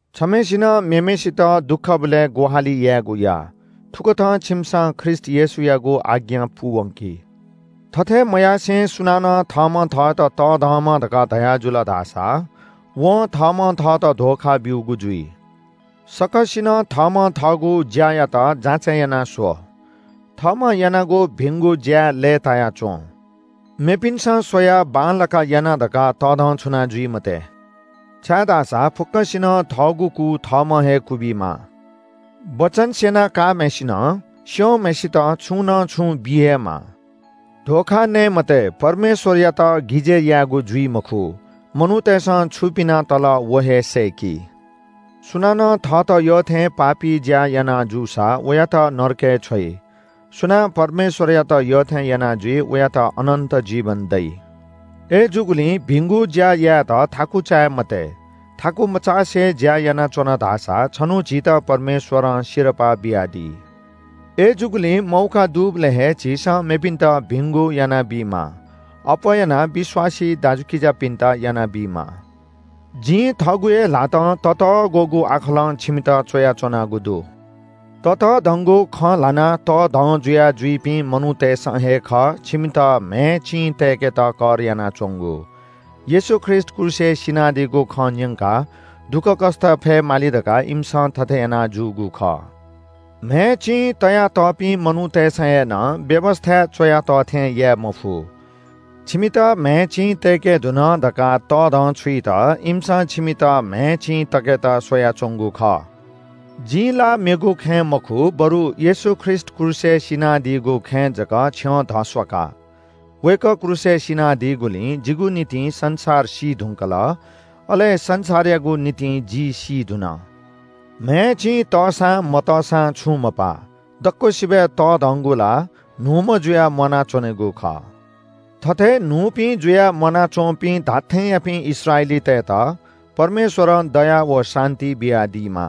छम्‍हय्‌सिनं मेम्‍हय्‌सित दुःखबलय् ग्‍वाहालि यायेगु या। थुकथं छिमिसं ख्रीष्‍ट येशूयागु आज्ञा पूवंकी। थथे मयासें सुनानं थःम्‍हं थःत तःधंम्‍ह धकाः धयाजुल धाःसा वं थःम्‍हं थःत धोखा ब्‍यूगु जुइ। सकसिनं थःम्‍हं थःगु ज्‍यायात जाँचय् याना स्‍व। थःम्‍हं यानागु भिंगु ज्‍याय् लय्‌ताया च्‍वँ। मेपिन्‍सं स्‍वयाः बांलाक यानागु दु धकाः तःधंछुना जुइ मते। छाय्‌धाःसा फुक्‍कसिनं थःगु कु थःम्‍हं हे क्‍वबीमाः। वचन स्‍यना काःम्‍हय्‌सिनं स्‍यंम्‍हय्‌सित छुं न छुं बी हे माः। धोखा नये मते, परमेश्‍वरयात गिजय् यायेगु जुइ मखु। मनूतय्‌सं छु पिना तल व हे सय्‌की। सुनानं थःत यःथें पापी ज्‍या याना जूसा वयात नरकय् छ्वइ। सुनां परमेश्‍वरयात यःथें याना जुइ वयात अनन्‍त जीवन दइ। अय्‌जूगुलिं भिंगु ज्‍या यायेत थाकु चाये मते। थाकु मचासे ज्‍या यानाच्‍वन धाःसा छन्‍हु झीत परमेश्‍वरं सिरपाः बियादी। अय्‌जूगुलिं मौका दुबलय् हे झीसं मेपिन्‍त भिंगु यानाबीमाः। अप्‍वः यानाः विश्‍वासी दाजुकिजापिन्‍त यानाबीमाः। जिं थःगु हे ल्‍हातं ततःग्‍वःगु आखलं छिमित च्‍वयाच्‍वनागु दु। ततःधंगु खँ ल्‍हानाः तःधं जुया जुइपिं मनूतय्‌सं हे खः छिमित म्‍हय् चिं तय्‌केत कर यानाच्‍वंगु। येशू ख्रीष्‍ट क्रूसय् सिनादीगु खँ न्‍यंकाः दुःखकष्‍ट फयेमाली धकाः इमिसं थथे याना जूगु खः। म्‍हय् चिं तयातःपिं मनूतय्‌सं हे नं व्‍यवस्‍थाय् च्‍वया तः थें याये मफु। छिमित म्‍हय् चिं तय्‌के धुन धकाः तःधंछुइत इमिसं छिमित म्‍हय् चिं तय्‌केत स्‍वयाच्‍वंगु खः। जिं ला मेगु खँय् मखु, बरु येशू ख्रीष्‍ट क्रूसय् सिनादीगु खँय् जक छ्यं धस्‍वाका। वय्‌कः क्रूसय् सिनादीगुलिं जिगु निंतिं संसार सी धुंकल, अले संसारयागु निंतिं जि सी धुन। म्‍हय् चिं तःसां मतःसां छुं मपा। दक्‍वसिबय् तःधंगु ला न्‍हूम्‍ह जुयाः म्‍वानाच्‍वनेगु खः। थथे न्‍हूपिं जुयाः म्‍वानाच्‍वंपिं धात्‍थेंयापिं इस्राएलीतय्‌त परमेश्‍वरं दया व शान्‍ति बियादीमा।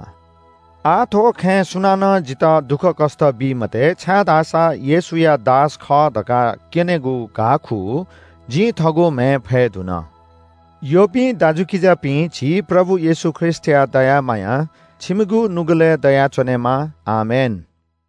आः थ्‍व खँय् सुनानं जितः दुःखकष्‍ट बी मते, छाय्‌धाःसा येशूया दास खः धकाः क्‍यनेगु घाःखू जिं थःगु म्‍हय् फये धुन। यःपिं दाजुकिजापिं, झी प्रभु येशू ख्रीष्‍टया दया माया छिमित दयाच्‍वनेमा। आमेन।